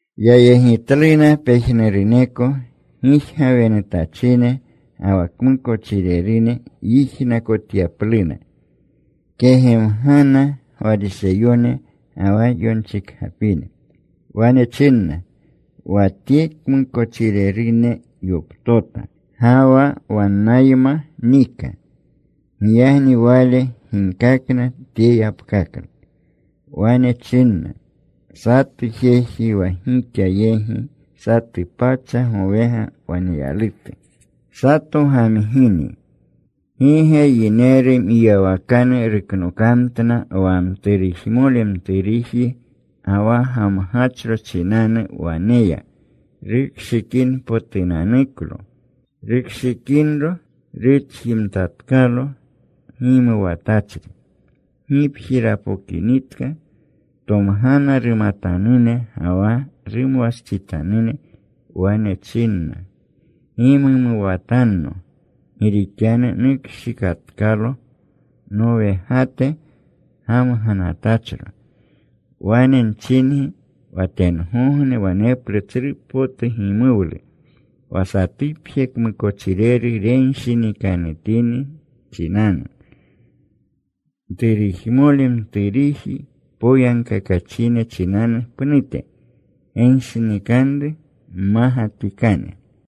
Yayegitluna pejnuruneko gijgawenutachine ga wa kmukochirerune yijnakotyapluna. Kegemgana Gwariseyone ga wa yonchikgapine. Wane chinna, “Wa Tye kmukochirerune yoptota. Ga wa wannayma nika.” Giyagni Wale ginkakna tye yapkaklu. Wane chinna, “Satu jeji wa gixa yegi satu pacha gowega waneyalutu, sato gamgini ¿gi ge yineru mwiyawakanu ruknokamtna wa mturujmole mturuji ga wa gamgachro chinanu wane ya rukshikinpotunanuko? Rukshikinro, rutjimtatkalo gimuwatachri. Gipji rapokinitka tomgana rumatanune ga wa rumwastsitanune. Wane chinna, ‘Gimumuwatanno. Gi rixanu nukshikatkalo nowegate gamganatachro.’ Wane nchingi, wa tengogne waneplu tsru potu gimuwlu wa satupje kmukochireru renshinikanutinri chinanu, mturujmole mturuji poyagkakachine chinanu pnute, genshinikanru mmagatikane.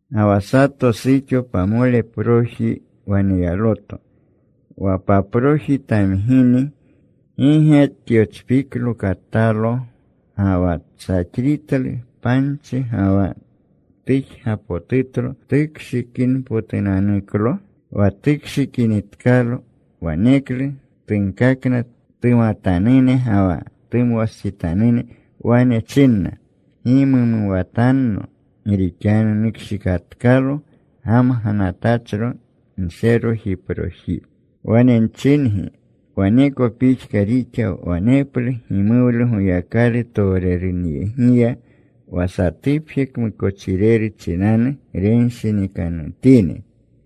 “Ga wa sato suxo pamoleproji waneyaloto, wa paproji tamgini ¿gi ge tyochpiklo katalo, ga wa tsaxritlu panchi, ga wa tujgapotutlo tukshikinpotunanuklo? Wa tukshikinitkalo, waneklu tunkakna tumatanune ga wa tumwastsitanune. Wane chinna, ‘Gimumuwatanno. Gi rixanu nukshikatkalo gamganatachro nserojiproji.’ “Wane nchingi, waneko pixka rixa. Waneplu gimuwlu Goyakalu towrerunyegiya wa satupje kmukochireru chinanu renshinikanutini.”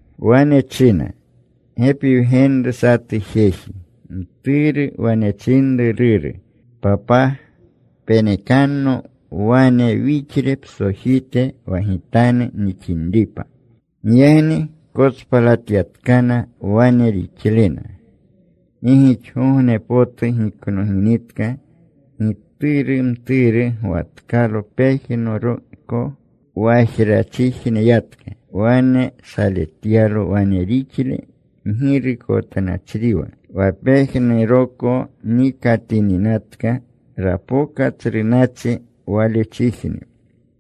Wane china, “Gepi wgenru satu jeji. Mturu wane chinru ruru, ‘Papaa, penekanno wane wixle psojite wa gitanu nixinripa.’ “Giyagni kotspalatyatkana wane rixlena. “Gi gixgogne potu giknoginitka, gituru mturu gwatkalo pejnuroko. Wajrachijne yatka. Wane saletyalo wane rixle mgirukotnachriwa. Wa pejnuroko nikatininatka, rapoka tsru nachi walechijne.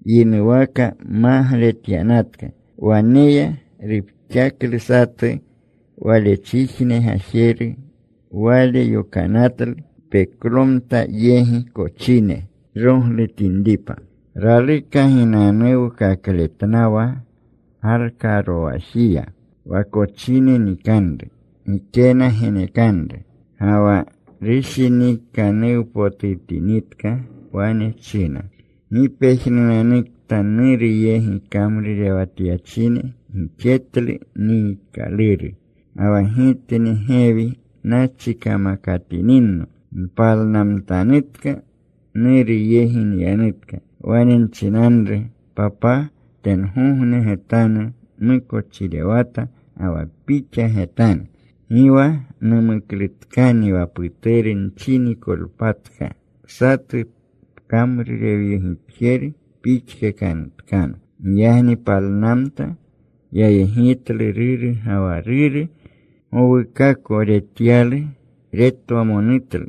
Yinuwaka magletyanatka. Wane ya. Rupxaklu satu walechijne gajeru. Wale yokanatlu peklomtate yegi kochine roglutinripa. Raluka ginanuwkakletnawa galkarowajiya wa kochine nikanru. Gikena genekanru. “Ga wa rushinikanuwpotutinitka, wane china, ‘¡Gi pejnunanukta nuru yegi kamrurewatyachine gixetlu niikaluru! Ga wa gitni gewi nachi kamakatininno. Npalnamtanutka. Nuru yegi nyanutka. Wane nchinanru, “Papaa, tengogne getanu nmukochirewata ga wa pixa getanu. Gi wa numuklutkani wa puturu nchinikolpatka. Satu pkamrurewyegitjeru pixkakanutkano.” ’ “Giyagni palnamta. Yayegitlu ruru. Ga wa ruru gowukako retyalu. Retwamonutlu.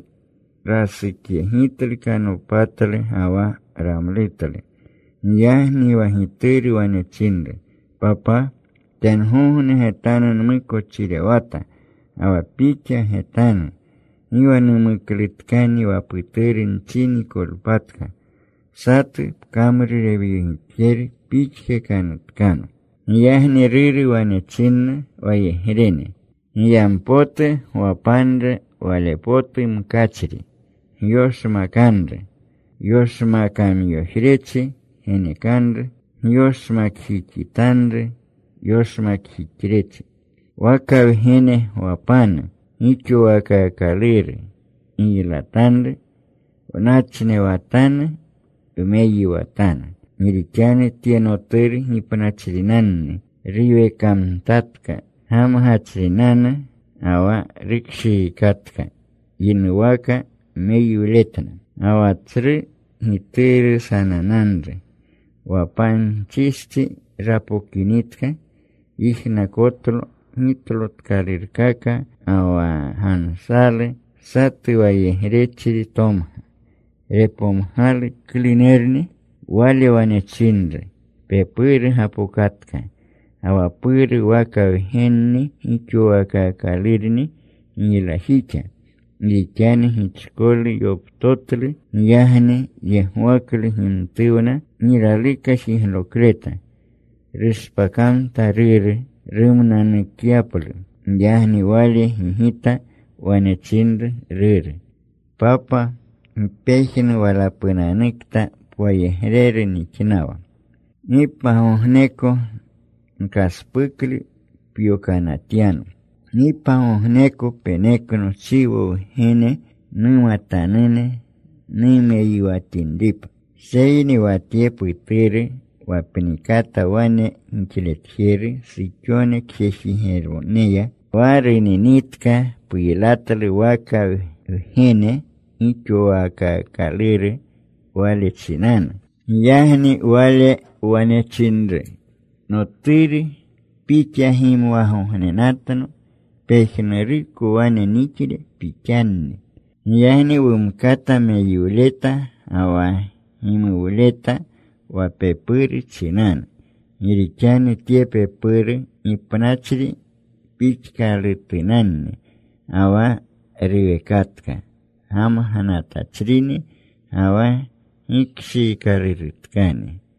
Rasukyegitlu. Kanopatlu ga wa ramlutlu. Giyagni wa gituru wane chinru, ‘Papaa, tengogne getanu nmukochirewata ga wa pixa getanu. Gi wa numuklutkani wa puturu nchinikolpatka. Satu pkamrurewyegitjeru pixkakanutkano.’ “Giyagni ruru wane chinna wayegrene, ‘Giyampotu gwapanru wale potu mkachri. Gyoshmakanru. Yoshmakamyojrechi genekanru. Gyoshmakjixitanru yoshmakjixrechi. Waka wgene gwapanu gixowaakaakaluru. Giylatanru. Wnachnewatanu. Wmeyiwatanu. Gi rixanu tye noturu gipnachrinanni. Ruwekamtatka. Gamgachrinanu ga wa rukshiikatka.’ Yinuwaka meyiwletna. “Ga wa tsru gituru sanananru. Wa panchistsi rapokinitka, yijnakotlo gitlotkalurkaka ga wa gansalu. Satu wayegrechri tomga. Repomgalu klunerni. Wale wane chinru, ‘Pepuru gapokatka, ga wa puru waka wgenni gixowaakaakalurni giylajixa. Gi rixanu gichkolu yoptotlu.’ “Giyagni yegwaklu gimtuwna. Gi raluka jiglokleta. Rushpakamta ruru rumnanukyaplu. Giyagni wale gigita. Wane chinru ruru, ‘Papa, ¡gi pejnu walapunanukta pwayegreru nixnawa! Gi pagogneko nkaspuklu pyokanatyano. Gi pagogneko penekno chiwo wgene numatanune numeyiwatinripa. Seyni wa tye puturu wa pnikata wane gixletjeru suxone kjejigeroneya, wa runinitka, puylatlu waka wgenpotuko gixowaakaakaluru wale chinanu.’ “Giyagni wale wane chinru, ‘Noturu, pixa gimwagognenatno. Pejnuruko wane nixle pixanni. Giyagni wumkata meyiwleta ga wa gimuwleta wa pepuru chinanu. Gi rixanu tye pepuru gipnachri pixkalutunanni, ga wa ruwekatka. Gamganatachrini ga wa gikshiikalurutkani.’”